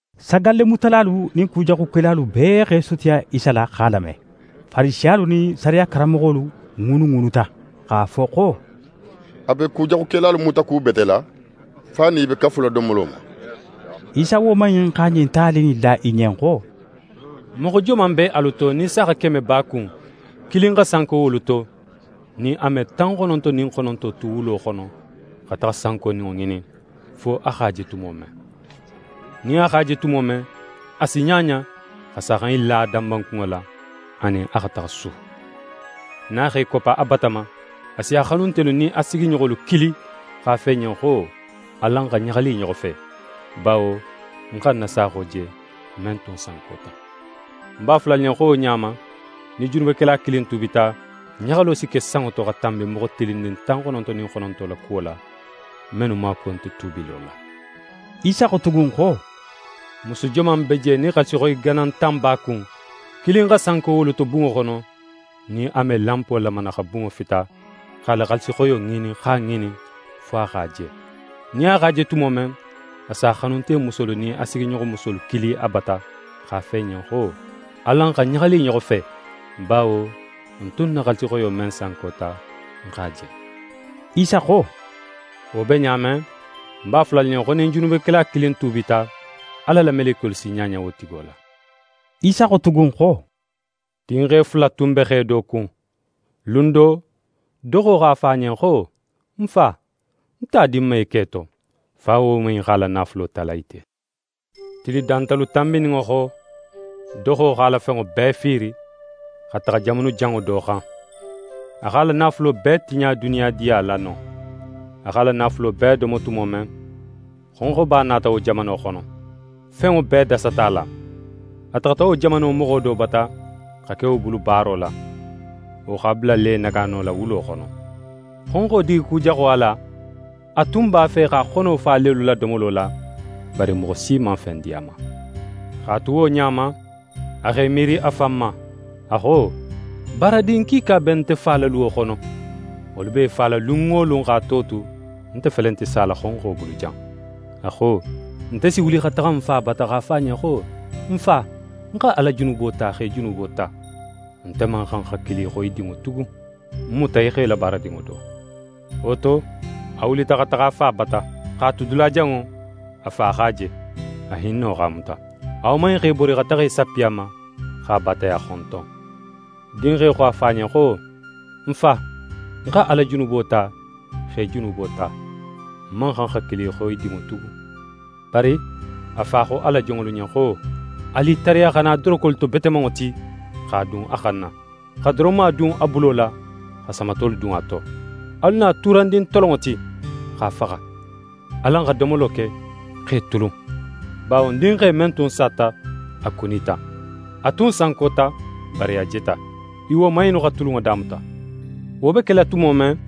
Sagallemutalalu nin kujaxukelalu bee x'e sutiya Isa la x'a lame. Farisiyalu nin sariya karanmoxolu ŋuunuŋuunuta x'a fo xo: «A be kujaxukelalu mutakubetela, fo a nin i be kafula domolo ma.» Isa woman in xa ɲin tali in la i ɲen xo: «Moxo joman be alu to, nin saaxa keme b'a kun, kilin xa sanko wolu to, nin a me tan xononto nin xononto tu wulo xono, xa taxa sankoninŋo ŋinin, fo a x'a je tumo men? Nin a x'a je tumo men, a si ɲaɲa, xa saaxa in la a danbankunŋo la, a nin a xa taxa su. Nin a x'é koppa a bata ma, a si a xanuntelu nin a sigiɲoxolu kili x'a fo i ɲen xo: “Alan xa ɲaxali i ɲoxo fe, bawo ń xa ń na saaxo je, men tun sankota.” Ń b'a fola alu ɲen xo wo ɲa ma, nin junubekela kilin tuubita, ɲaxalo si ke sanŋo to xa tanbi moxo tilinnin tan xononto nin xononto la kuwo la, mennu maakuwo nte tuubilo la.» Isa xo tugun xo: «Musu joman be je, nin xaalisixoyi ganan tan b'a kun, kilin xa sanko wolu to bunŋo xono, nin a me lanpo lamana, xa bunŋo fita, x'a la xaalisixoyo ŋinin, x'a ŋinin, fo a x'a je? Nin a x'a je tumo men, a s'a xanuntemusolu nin a sigiɲoxomusolu kili a bata, x'a fo i ɲen xo: “Alan xa ɲaxali i ɲoxo fe, bawo ń tun na xaalisixoyo men sankota, ń x'a je!”» Isa xo: «Wo be ɲa men, ń b'a fola alu ɲen xo, nin junubekela kilin tuubita, Ala la melekiyolu si ɲaɲa wo tigo la.» Isa xo tugun xo: «Dinxe fula tun be xe do kun. Lun do, doxo xo a fa ɲen xo: “Ń fa, ń ta di ń ma í ke to.” Fa woman in x'a la naafulo tala i te. Tili dantalu tanbininŋo xo, doxo x'a la fenŋo bee fiiri, xa taxa jamanu janŋo do xan. A x'a la naafulo bee tiɲa duniyadiya la non. A x'a la naafulo bee domo tumo men, xonxoba nata wo jamano xono. Fenŋo bee dasata a la. A taxata wo jamano moxo do bata, xa ke wo bulu baaro la. Wo x'a bula lenegaano la wulo xono. Xonxo digikujaxo a la, a tun b'a fe x'a xono fa lelu la domolo la, bari moxo si man fen di a ma. X'a tu wo ɲa ma, a x'é miiri a fan ma, a xo: “Baaradin kiika be nte fa la luwo xono, wolu b'e fala lun wo lun x'a to tu, nte felenti sala xonxo bulu jan.” A xo: “Nte si wuli xa taxa ń fa bata, x'a fo a ɲen xo: Ń fa, ń xa Ala junubo ta, x'é junubo ta. Nte man xan xa kili xo í dinŋo tugun. Ń muta í xo í la baaradinŋo do.” Wo to, a wulita xa taxa a fa bata. «X'a tu dulajanŋo, a fa x'a je. A hinno x'a muta: A woman in x'é bori xa taxa í sappi a ma, x'a baataya xonton. Dinxe xo a fa ɲen xo: “Ń fa, ń xa Ala junubo ta, x'é junubo ta. Ń man xan xa kili xo í dinŋo tugun.” Bari a fa xo a la jonŋolu ɲen xo: “Alu i tariya xa na dorokolu to betemanŋo ti, x'a dun a xanna, xa doronma dun a bulo la xa samatolu dun a to. Alu na tuurandin tolonŋo ti, x'a faxa. Alan xa domolo ke, x'e tulun, bawo ń dinxe men tun sata, a kunita. A tun sankota, bari a jeta.” I woman innu xa tulunŋo damuta. «Wo be kela tumo men,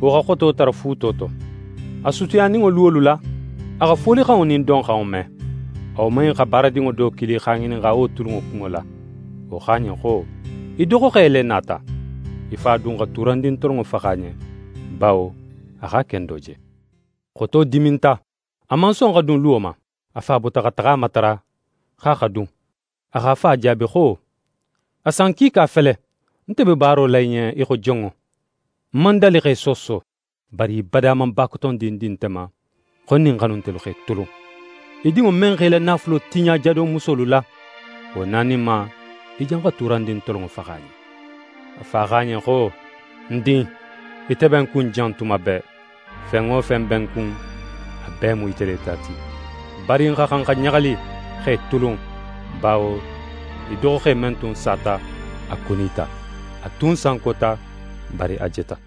wo xa xoto tara fuuto to. A sutiyaninŋo luwolu la, a xa folixanŋo nin donxanŋo me. A woman in xa baaradinŋo do kili x'a ŋininxa wo tulunŋo kunŋo la. Wo xo a ɲen xo: “Í doxoxe le nata. Í fa dun xa tuurandin tolonŋo faxa a ɲen, bawo a x'a kendo je.” Xoto diminta, a man son xa dun luwo ma. A fa bota xa taxa a matara, xo a xa dun. A x'a fa jaabi xo: “A san kiika fele, nte be baaro la í ɲen í xo jonŋo, ń man dali x'é sooso. Bari í bada man bakotondin di nte ma xo ń nin ń xanuntelu x'e tulun. Í dinŋo men x'é la naafulo tiɲa jadomusolu la, wo naninma, í janxa tuurandin tolonŋo faxa a ɲen.” A fa xo a ɲen xo: “Ń din! Ite be ń kun jan tuma bee. Fen wo fen be ń kun, a bee mu ite le ta ti. Bari n xa xan xa ɲaxali, x'e tulun, bawo í doxoxe men tun sata, a kunita. A tun sankota, bari a jeta.”»